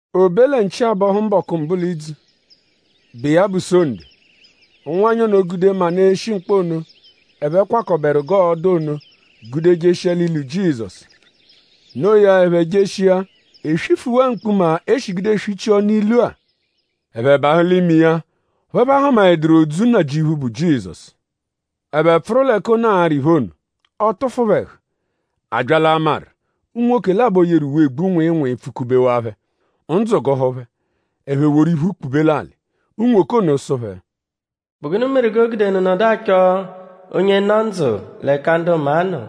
O be lẹ nchi-abọhu mbọku mbụ l'idzu, bụ iya bụ Sonde; ụnwanyi ono gude manụ, eshi mkpọ ono, ẹphe kwakọberu g'ọo-dụ ono gude jeshia l'ilu Jizọsu. Noo ya; ẹphe jeshia; e swifuwaa mkpuma, e shi gude swichia ọnu ilu-a. Ẹphe bahụ l'ime iya; ọphu ẹphe ahụmaeduru odzu Nnajịuphu, bụ Jizọsu. Ẹphe pfụru l'ẹka ono arị iphe ono; ọ tụfu phẹ ẹhu. A bya l'amarụ; unwoke labọ, yeru uwe, egbu nwịinwii pfụ-kubewaa phẹ. Ndzụ gụhu phẹ; ẹphe woru iphu kpube l'alị. Unwoke ono sụ phẹ: “?Bụ gụnu meru g'o gude unu nọdu achọ onye nọ ndzụ l'ẹka ndu maa nọ?”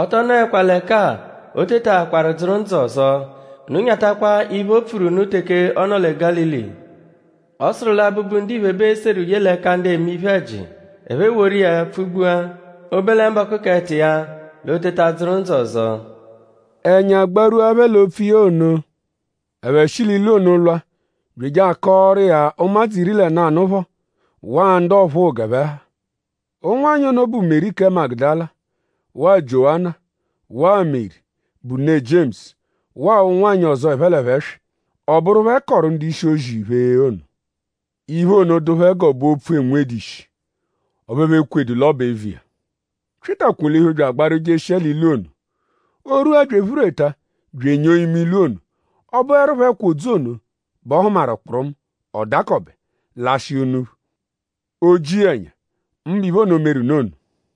“Ọ tọ nọekwa l'ẹka-a. O tetaakwaru dzụru ndzụ ọzo. Unu nyatakwa iphe, o pfuru unu teke ọ nọ lẹ Gálili. Ọ sụru lẹ Abụbu-Ndiphe bẹ ee-seru ye l'ẹka ndu eme iphe-ẹji. Ẹphe eworu iya pfụ-gbua. O -be lẹ mbọku k'ẹto iya l'o teta dzụru ndzụ ọzo.” Ẹnya gbarwua phẹ l'opfu iya ono. Ẹphe shi l'ilu ono lwa bya eje akọoru iya ụmadzu iri lẹ nanụ phọ; waa ndu ọphuu g'ẹphe ha. Ụnwanyi ono bụ Meri kẹ Magudala; waa Jiowana; waa Meri, bụ ne Jiemusu; waa ụnwanyi ọzo, ẹphe l'ẹphe swị. Ọ bụru phẹ kọoru ndu-ishi-ozi iphe ono. Iphe ono dụ phẹ g'ọ bụ opfu, 'enwedu ishi; ọphu ẹphe ekwedu l'ọ bụ eviya. Pyịta kwolihu bya agbaru jeshia l'ilu ono. O rwua bya ephureta bya enyoo ime ilu ono. Ọ bụerupho ẹkwa odzu ono bẹ ọ hụmaru kpụrumu. Ọ dakọbe; lashịa unuphu. O ji iya ẹnya; mbụ iphe ono, meru nụ ono.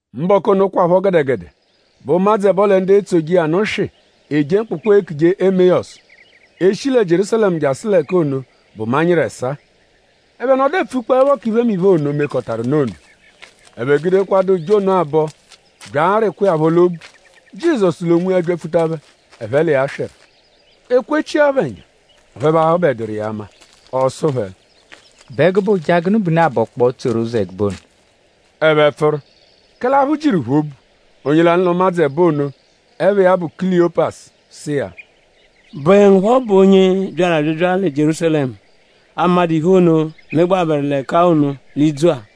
Mbọku ono kwaphọ gẹdegede bẹ ụmadzu ẹbo lẹ ndu etsoje iya nụ swị eje mkpụkpu, eekuje Emeyọsu. E -shi lẹ Jierúsalẹmu jasụ l'ẹka ono bụ manyịru ẹsaa. Ẹphe nọdu epfukpọepho k'iphemiphe ono, mekọtaru nụ ono. Ẹphe gudekwadụ ụja ono abọ bya arịkwa iya phọ l'obu; Jizọsu l'onwiya byapfuta phẹ; ẹphe l'iya swịru. E kwechia phẹ ẹnya; ọphu ẹphe ahụbeduru iya ama. Ọ sụ phẹ: “?Bụ ẹgube ụja gụnu bẹ unu abọkpoo tsoru ụzo ẹgube ono?” Ẹphe pfụru; kẹle aphụ jiru phẹ obu. Onye lanụ l'ụmadzu ẹbo ono, ẹpha iya bụ Kuliyopasu sụ iya: “?Bụe ngu phọ bụ onye byaru abyabya lẹ Jierúsalẹmu, 'amadụ iphe ono, megbabẹru l'ẹka ono l'idzu-a?”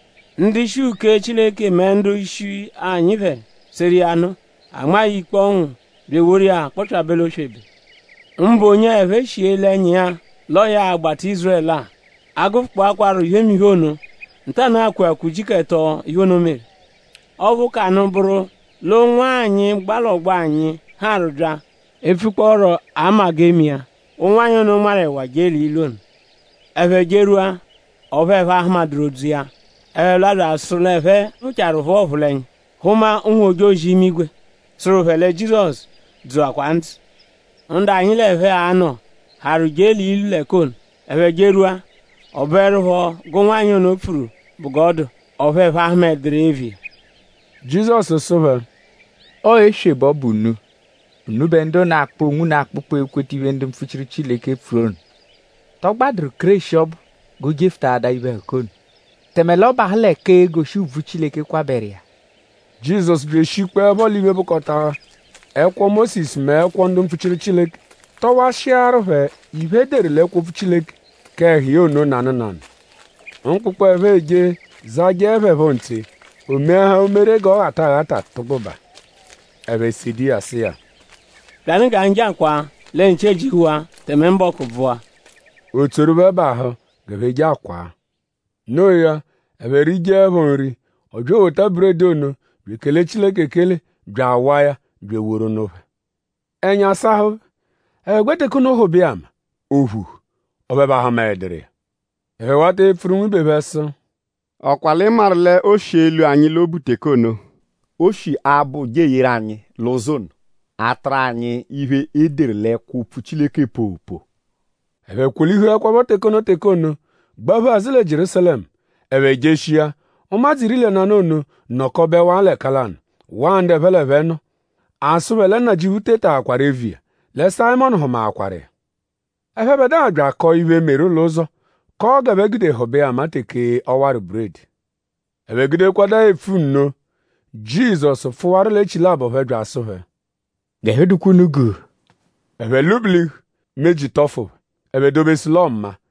Ndu-ishi uke Chileke mẹ ndu-ishi anyi phẹ seru iya nụ; a nmaa ya ikpe ọnwu bya eworu iya kpọpyabe l'oswebe. Mbụ onye-a, ẹphe shi ele ẹnya iya l'ọo ya a-gbata Ízurẹlu-a. A -gụfukpokwaaro iphemiphe ono; ntanụ-a kweakwaa ujiku ẹto, iphe ono meru. Ọphu, ka nụ bụru l'ụnwanyi, gba l'ọgbo anyi harụ bya epfukpọoro 'ama-g'ee-me-iya. Ụnwanyi ono nmarụ ẹwa jee l'ilu ono. Ẹphe jerwua; ọphu ẹphe ahụmaeduru odzu iya. Ẹphe lwa bya asụ l'ẹphe phụchaaru phụa ọphulenya; hụma ụnwu-ojozi-imigwe, sụru phẹ lẹ Jizọsu dzụakwaa ndzụ. Ndu anyi l'ẹphe anọ harụ je l'ilu l'ẹka ono. Ẹphe jerwua; ọ bụerupho g'ụnwanyi ono pfuru bụ g'ọ dụ; ọphu ẹphe ahụmaeduru iya eviya.” Jizọsu sụ phẹ: “Ọo éswè bẹ ọ bụ unu; unubẹ ndu ono, akpụ onwunu akpụkpu ekweta iphe, ndu mpfuchiru Chileke pfuru ono.” ?Tọ gbadụru Kéreshi ọbu g'o jefụtaadaa iphe-ẹhuka ono; tẹme l'ọ bahụ l'ẹka e-goshi ùbvù, Chileke kwabẹru iya? Jizọsu bya eshikpọepho l'iphe, bụkota ẹkwo Mósisu mẹ ẹkwo ndu mpfuchiru Chileke; tọwashiaru phẹ iphe, e deru l'ẹkwo-opfu Chileke k'ẹhu iya ono nanụ nanụ. Mkpụkpu, ẹphe eje zajẹe phẹ phọ ntse; o meahaa umere g'ọ ghata aghata tụgbubaa. Ẹphe sede iya sụ iya: “Byanụ g'anyi je akwaa; lẹ nchi ejihuwaa; tẹme mbọku bvụwaa.” O tsoru phẹ bahụ g'ẹphe je akwaa. Noo ya; ẹphe rijeẹpho nri; ọ bya ewota buredi ono bya ekele Chileke ekele; bya awaa ya; bya eworu nụ phẹ. Ẹnya sahụ phẹ. Ẹphe gbẹ teke ono hụbe iya ama. O phuhu; ọphu ẹphe ahụmaeduru iya. Ẹphe wata epfuru nwibe phẹ sụ: “?Ọ kwa l'ị maru l'o shi elwu anyi l'obu teke ono, o shi abọ ụja eyeru anyi l'ụzo ono; atụru anyi iphe, e deru l'ẹkwo-opfu Chileke poopoo.” Ẹphe kwolihuẹkwapho teke ono teke ono; gbaphu azụ lẹ Jierúsalẹmu. Ẹphe jeshia; ụmadzu iri lẹ nanụ ono nọkobewaa l'ẹka lanụ; waa ndu ẹphe l'ẹphe nọ. A sụ phẹ lẹ Nnajịuphu tetaakwaru eviya; lẹ Sayịmonu hụmakwaru iya. Ẹphebedua bya akọo iphe, meru l'ụzo; kọo g'ẹphe gude hụbe iya ama teke ọ warụ buredi. Ẹphe gudekwadụa epfu nno; Jizọsu pfụwaru l'echilabọ phẹ bya asụ phẹ: “G'ẹhu dụkwa unu gu.” Ẹphe lwụ-bilihu; meji tọfu phẹ. Ẹphe dobesu l'ọo maa.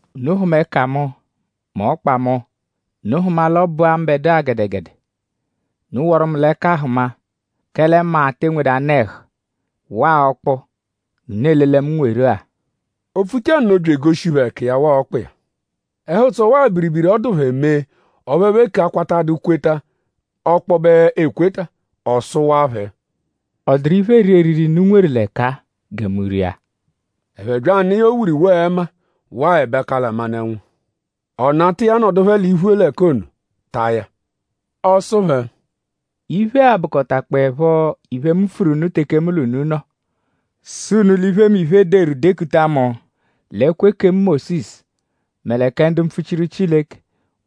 “Unu hụma ẹka mu mẹ ọkpa mu. Unu hụma l'ọ bụ-a mbẹdua gẹdegede. Unu wọru mu l'ẹka hụma; kẹle maa te enwedu anụ-ẹhu waa ọkpu g'unu ele lẹ mu nweru-a.” O pfuchaa nno bya egoshi phẹ ẹka iya; waa ọkpa iya. Ẹhu-ụtso; waa biribiri, ọ dụ phẹ mee ọphu ẹphe eke akwatadu kweta ọkpobe ekweta. Ọ sụwaa phẹ: “?Ọ dụru iphe, eeri eriri, unu nweru l'ẹka-a gẹ mu ria?” Ẹphe bya anụ iya owuriwo ẹma waa ẹbakala manụ-ẹnwu. Ọ nata iya nọdu phẹ l'iphu l'ẹka ono taa ya. Ọ sụ phẹ: “Iphe-a bụkotakpoepho iphe, mu pfuru unu teke mu l'unu nọ; sụ unu l'iphemiphe, e deru dekuta mu l'ẹkwo ekemu Mósisu mẹ kẹ ndu mpfuchiru Chileke;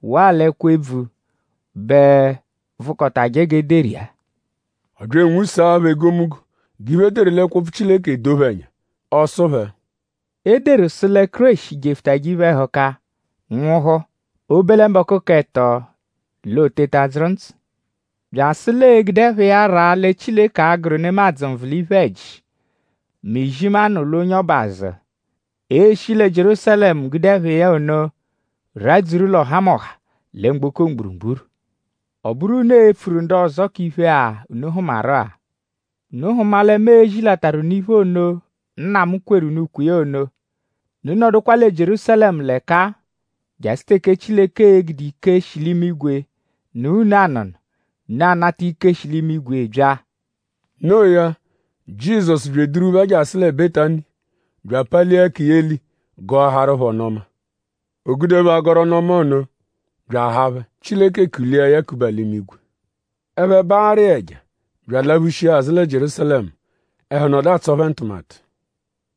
waa l'ẹkwo-ebvu bẹ vụkotaje g'e deru iya.” Ọ bya anwụsaa phẹ egomunggo g'iphe, e deru l'ẹkwo-opfu Chileke edoo phẹ ẹnya. Ọ sụ phẹ: “E deru sụ lẹ Kéreshi jefụtaje iphe-ẹhuka nwụhu; o -be lẹ mbọku k'ẹto l'o teta dzụru ndzụ. Bya asụ l'ee-gude ẹpha iya raa lẹ Chileke a-gụru nemadzụ nvụ l'iphe-ẹji; mẹ izimanụ -lwa onye ọbu azụ. Ee-shi lẹ Jierúsalẹmu gude ẹpha iya ono radzuru l'ọhamoha lẹ mgboko mgburugburu. Ọ bụru unu e-pfuru ndu ọzo k'iphe-a, unu hụmaru-a. Unu hụma lẹ mu e-zilataru unu iphe ono, Nna mu kweru unu ukwe iya ono. Unu nọdukwa lẹ Jierúsalẹmu l'ẹka-a jasụ teke Chileke e-gude ike, shi l'imigwe nụ̀á unu anụ̀nù; unu anata ike, shi l'imigwe bya.” Noo ya; Jizọsu bya eduru phẹ jasụ lẹ Betani; bya apalia ẹka iya eli gọahaaru phẹ ọnu-ọma. O gude phẹ agọru ọnu-ọma ono bya ahaa phẹ. Chileke kulia ya kuba l'imigwe. Ẹphe baarụ iya ẹja bya alaphushia azụ lẹ Jierúsalẹmu. Ẹhu nọdu atsọ phẹ ntụmatu.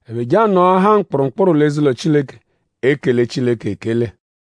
Ẹphe je anọahaa mkpụrumkpuru l'eze-ụlo Chileke; ekele Chileke ekele.